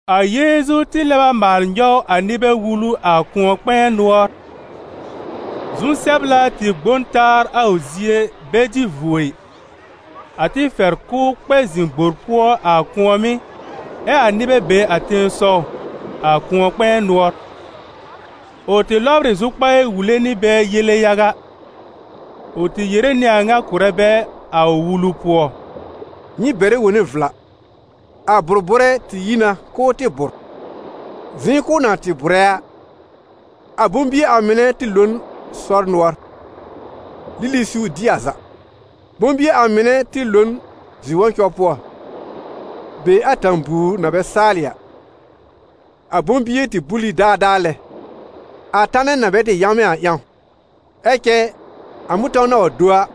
A Yeezu tɩ lɛb a maal nyɔw a nɩbɛ wulu a kʋ̃ɔ-kpɛ̃ɛ nʋɔr. Zu-sɛbla tɩ gbõ n taa a ʋ zie bɛ dɩ vuo ɩ, a tɩ fɛr k'ʋ kpɛ zɩ̃ gbor pʋɔ a kʋ̃ɔ̀mɩ́ ɛ a nɩbɛ be a tẽsɔw, a kʋ̃ɔ-kpɛ̃ɛ nʋɔr. Ʋ tɩ lɔbr ɩ zʋkpaɩ wule nɩ bɛ yele yaga. Ʋ tɩ yere nɩ a ŋa kʋ̀rɛ bɛ a ʋ wulu pʋɔ: «Nyɩ bɛrɛ wone vla. A bʋ̀r-bʋ̀rɛ tɩ yi na k'ʋʋ tɩ bʋ̀r. Zɩ̃ kɛ ʋ na tɩ bʋ̀rɛ a, a bʋ̃-bie a mɩnɛ tɩ lo n sɔr nʋɔr, lili siw dɩ a za. Bʋ̃-bie a mɩnɛ mɩ̀ tɩ lo n zi-wɔ̃cɔ pʋɔ, be tẽ-buwr na bɛ saalɩ a; a bʋ̃-bie tɩ bul ɩ daadaa lɛ, a tanɛ na bɛ tɩ yãwmɛ̃ a ƴãw. Ɛ cɛ a mʋ̃tɔ̃w na wa do a,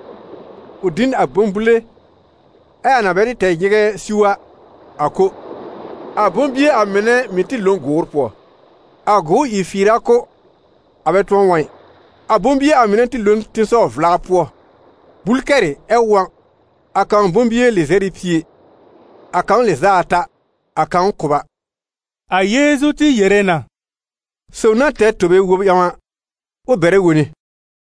ʋ dɩ n a bʋ̃-bule, ɛ a na bɛ tɩ tɛ nyɩgɛ siw a, a ko. A bʋ̃-bie a mɩnɛ mɩ̀ tɩ lo n gʋʋr pʋɔ, a gʋʋr ìr fɩɩr a kʋ́, a bɛ tʋ̃ɔ wɔ̃ ɩ. A bʋ̃-bie a mɩnɛ tɩ lo n tẽsɔw-vla pʋɔ, bul kɛrɩ ɛ wɔ̃: a kãw bʋ̃-bie lɩzɛr nɩ pie, a kãw lɩz'a ata, a kãw kʋba.» A Yeezu tɩ yere na: «Sob na tɛr tobe bɛr-wob ƴãw a, ʋ bɛrɛ wone.»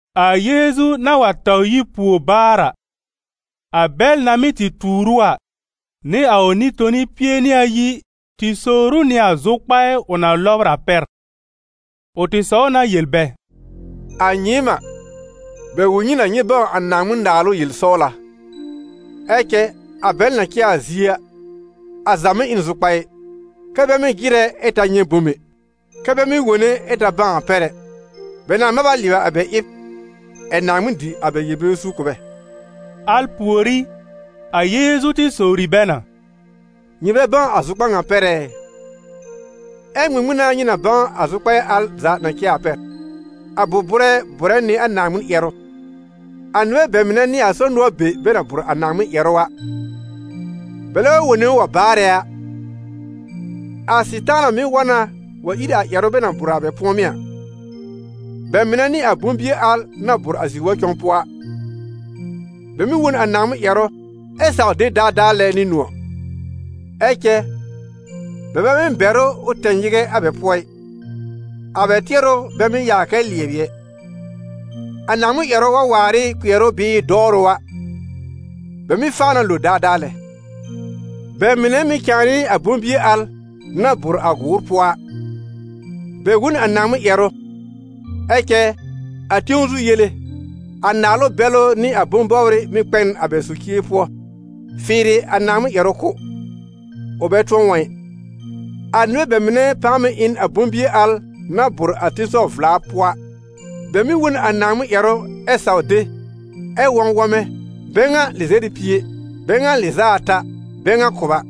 A Yeezu na wa taw yi pùor baar a, a bɛl na mɩ́ tɩ tuur ʋ a, nɩ a ʋ Nɩ-toni pie nɩ ayi tɩ sowr ʋ nɩ a zʋkpaɩ ʋ na lɔbr a pɛr. Ʋ tɩ sɔw na yel bɛ: «A nyɩɩm a, bɛ wul nyɩ na nyɩ bãw a Naaŋmɩn-Naalʋ yel-sɔwla; ɛ cɛ a bɛl na cɛ a zie a, a za mɩ́ ɩ n zʋkpaɩ, kɛ́ bɛ mɩ́ jɩrɛ ɛ ta nyɛ̃ bom ɛ, kɛ́ bɛ mɩ́ wone ɛ ta bãw a pɛr ɛ, bɛ nãà mab a lɩɛbɩ a bɛ ɩb ɛ̀ Naaŋmɩn dɩ a bɛ yel-bebe suur kʋ̀ bɛ.» Al pùorí, a Yeezu tɩ sowri bɛ na: «Nyɩ bɛ bãw a zʋkpar ŋa pɛr ɛ? Ɛ ŋmɩŋmɩn n'a nyɩ na bãw a zʋkpaɩ al za na cɛ a pɛr? A bʋ̀r-bʋ̀rɛ bʋ̀rɛ nɩ a Naaŋmɩn ƴɛrʋ. A nɩbɛ bɛ mɩnɛ n'ɩ a sɔr nʋɔr be bɛ na bʋ̀r a Naaŋmɩn ƴɛrʋ a: bɛlɛ wa wone ʋ wa baarɛ a, a Sɩtaana mɩ́ wa na wa ír a ƴɛrʋ bɛ na bʋ̀r a bɛ pʋ̃ɔmɩ́ a. Bɛ mɩnɛ n'ɩ a bʋ̃-bie al na bʋ̀r a zi-wɔ̃cɔ pʋɔ a: bɛ mɩ́ wõ n a Naaŋmɩn ƴɛrʋ ɛ saw de daadaa lɛ nɩ nʋ̃ɔ̀. Ɛ cɛ bɛ bɛ mɩ́ bɛr ʋ ʋ tɛ nyɩgɛ a bɛ pʋɔ ɩ, a bɛ tɩɛrʋ bɛ mɩ́ yaa kɛ lɩɛbɩ ɛ. A Naaŋmɩn ƴɛrʋ wa waar ɩ kpɩɛrʋ bɩɩ dɔwrʋ a, bɛ mɩ́ faa na lo daadaa lɛ. Bɛ mɩnɛ mɩ̀ cãa n'ɩ a bʋ̃-bie al na bʋ̀r a gʋʋr pʋɔ a: bɛ wõ n a Naaŋmɩn ƴɛrʋ, ɛ cɛ a tẽw zu yele, a naalʋ bɛlʋ nɩ a bʋ̃-bɔbrɩ mɩ́ kpɛ n a bɛ socie pʋɔ fɩɩrɩ a Naaŋmɩn ƴɛrʋ kʋ́, ʋ bɛ tʋ̃ɔ wɔ̃ ɩ. A nɩbɛ bɛ mɩnɛ pãa mɩ̀ ɩ n a bʋ̃-bie al na bʋ̀r a tẽsɔw-vla pʋɔ a; bɛ mɩ́ wõ n a Naaŋmɩn ƴɛrʋ ɛ saw de, ɛ wɔ̃ wɔ̃mɛ: bɛ ŋa lɩzɛr nɩ pie, bɛ ŋa lɩz'a ata, bɛ ŋa kʋba.»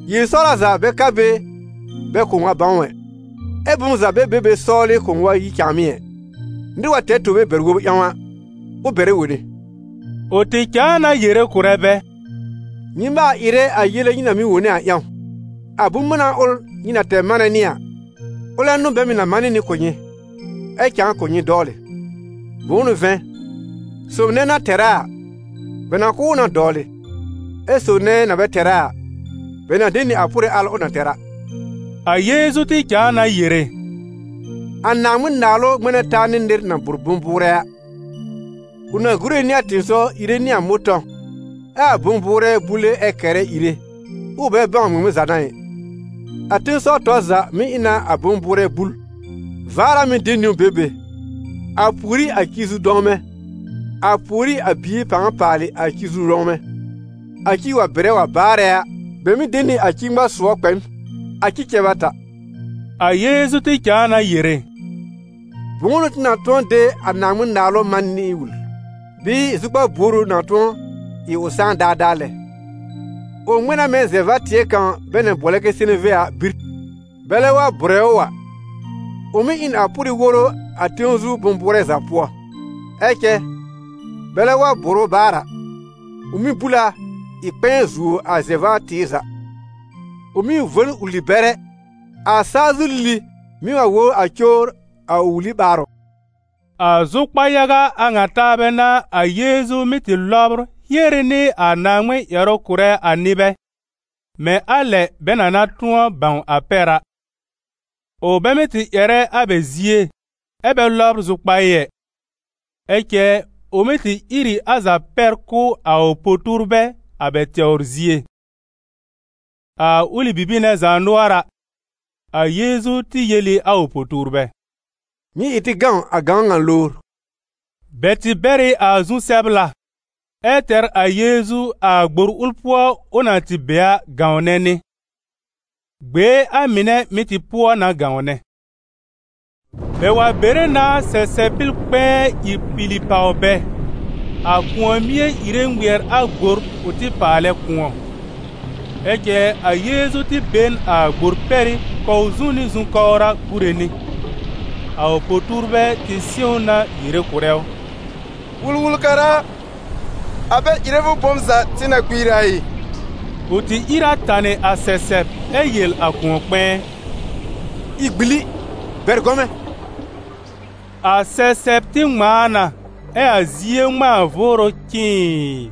Yel-sɔwla za bɛ ka be bɛ kʋ̃ʋ wa bãw ɛ, ɛ bom za bɛ be be sɔwlɩ kʋ̃ʋ wa yi cãàmɩ́ ɛ. Nɩr wa tɛr tobe bɛr-wob ƴãw a, ʋ bɛrɛ wone.» Ʋ tɩ cãa na yere kʋ̀rɛ bɛ: «Nyɩ maal ɩrɛ a yele nyɩ na mɩ́ wone a ƴãw: a bʋ̃-mána ʋl nyɩ na tɛr manɛ nɩ a, ʋlɛ n'ʋ bɛ mɩ́ na manɩ nɩ kʋ̀ nyɩ, ɛ cãa kʋ̀ nyɩ dɔwlɩ. Bʋ̃ʋ n'ʋ vɛ̃, sob nɛ na tɛr a a, bɛ na kʋ̀ ʋ na dɔwlɩ, ɛ sob nɛ na bɛ tɛr a a, bɛ na de nɩ a pʋrɩ al ʋ na tɛr a.» A Yeezu tɩ cãa na yere: «A Naaŋmɩn-Naalʋ ŋmɛ̃ na taa nɩ nɩr na bʋ̀r bʋ̃-bʋʋrɛ a. Ʋ na gúre nɩ a tɩ̃ɩsɔw ìre nɩ a mʋ̃tɔ̃w, ɛ a bʋ̃-bʋʋrɛ búle ɛ kɛrɛ ìre, ʋʋ bɛ bãw ŋmɩŋmɩn za n'a ɩ. A tẽsɔw tɔr za mɩ́ ɩ na a bʋ̃-bʋʋrɛ bul: vaar a mɩ́ de niwn be be, a pùorí a ci-zu-dɔ̃wmɛ̃, a pùorí a bie pãa paalɩ a ci-zu-dɔ̃wmɛ̃. A ci wa bɩrɛ wa baarɛ a, bɛ mɩ́ de nɩ a ci-ŋma-sʋɔ kpɛ n, a ci cɛb a ta.» A Yeezu tɩ cãa na yere: «Bʋ̃ʋ n'ʋ tɩ na tʋ̃ɔ de a Naaŋmɩn-Naalʋ man nɩ wul? Bɩɩ zʋkpar buor ʋ na tʋ̃ɔ ɩ ʋ sãá daadaa lɛ? Ʋ ŋmɛ̃ na mɛ̃ zɛ-va-tɩɛ kãw bɛ na bʋɔlɛ kɛ seneve a bir. Bɛlɛ wa bʋ̀rɛ ʋ a, ʋ mɩ́ ɩ n a pʋrɩ woro a tẽw zu bʋ̃-bʋʋrɛ za pʋɔ. Ɛ cɛ bɛlɛ wa bʋ̀r ʋ baar a, ʋ mɩ́ bul a ɩ kpɛ̃ɛ zuo a zɛ-va-tɩɩr za. Ʋ mɩ́ vo n wuli-bɛrɛ, a saa zu lili mɩ́ wa wobr a cowr a ʋ wuli ɓaarʋ́.» A zʋkpa-yaga a ŋa taabɛ n'a a Yeezu mɩ́ tɩ lɔbr hiere nɩ a Naaŋmɩn ƴɛrʋ kʋ̀rɛ a nɩbɛ, mɛ̃ a lɛ bɛ na na tʋ̃ɔ bãw a pɛr a. Ʋ bɛ mɩ́ tɩ ƴɛrɛ a bɛ zie ɛ bɛ lɔbr zʋkpaɩ ɩ, ɛ cɛ ʋ mɩ́ tɩ ír ɩ a za pɛr kʋ̀ a ʋ po-tuurbɛ a bɛ tɛwr zie. A ʋlɩ bibir nɛ zaanʋɔra, a Yeezu tɩ yel ɩ a ʋ po-tuurbɛ: «Nyɩ ɩ tɩ gãw a gãwn ŋa lowr.» Bɛ tɩ bɛr ɩ a zu-sɛbla, ɛ tɛr a Yeezu a gbor ʋl pʋɔ ʋ na tɩ be a gãwnɛ nɩ. Gbee a mɩnɛ mɩ̀ tɩ pʋɔ na gãwnɛ. Bɛ wa bere na sɛsɛb-pɩl kpɛ̃ɛ ìr pili pàw bɛ, a kʋ̃ɔ-mie ìre ŋmɩɛr a gbor ʋ tɩ paalɛ kʋ̃ɔ. Ɛ cɛ a Yeezu tɩ be n a gbor pɛrɩ́ kɔw zu nɩ zu-kɔwra gúre nɩ. A ʋ po-tuurbɛ tɩ sɩ̃w ʋ na yere kʋ̀rɛ ʋ: «Wul-wul-kara a, a bɛ ɩrɛ fʋ bom za tɩ na kpiir a ɩ?» Ʋ tɩ ìr a tanɩ a sɛsɛb ɛ yel a kʋ̃ɔ-kpɛ̃ɛ: «Ɩ gbili! Bɛr gɔmɛ̃!» A sɛsɛb tɩ ŋmãa na ɛ a zie ŋmãa vʋʋrʋ cɩ̃ɩɩ!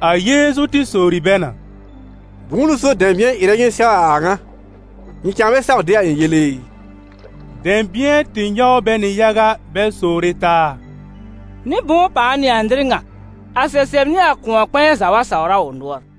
A Yeezu tɩ sowri bɛ na: «Bʋ̃ʋ n'ʋ so dɛ̃bɩ̃ɛ ɩrɛ nyɩ sɛw a a ŋa? Nyɩ cãa bɛ saw de a ɩ̃ yele ɩ?» Dɛ̃bɩ̃ɛ tɩ nyɔw bɛ nɩ yaga bɛ sowre taa: «Nɩ-bʋ̃ʋ pãa n'ɩ a nɩr ŋa, a sɛsɛb nɩ a kʋ̃ɔ-kpɛ̃ɛ za wa sawr a ʋ nʋɔr?»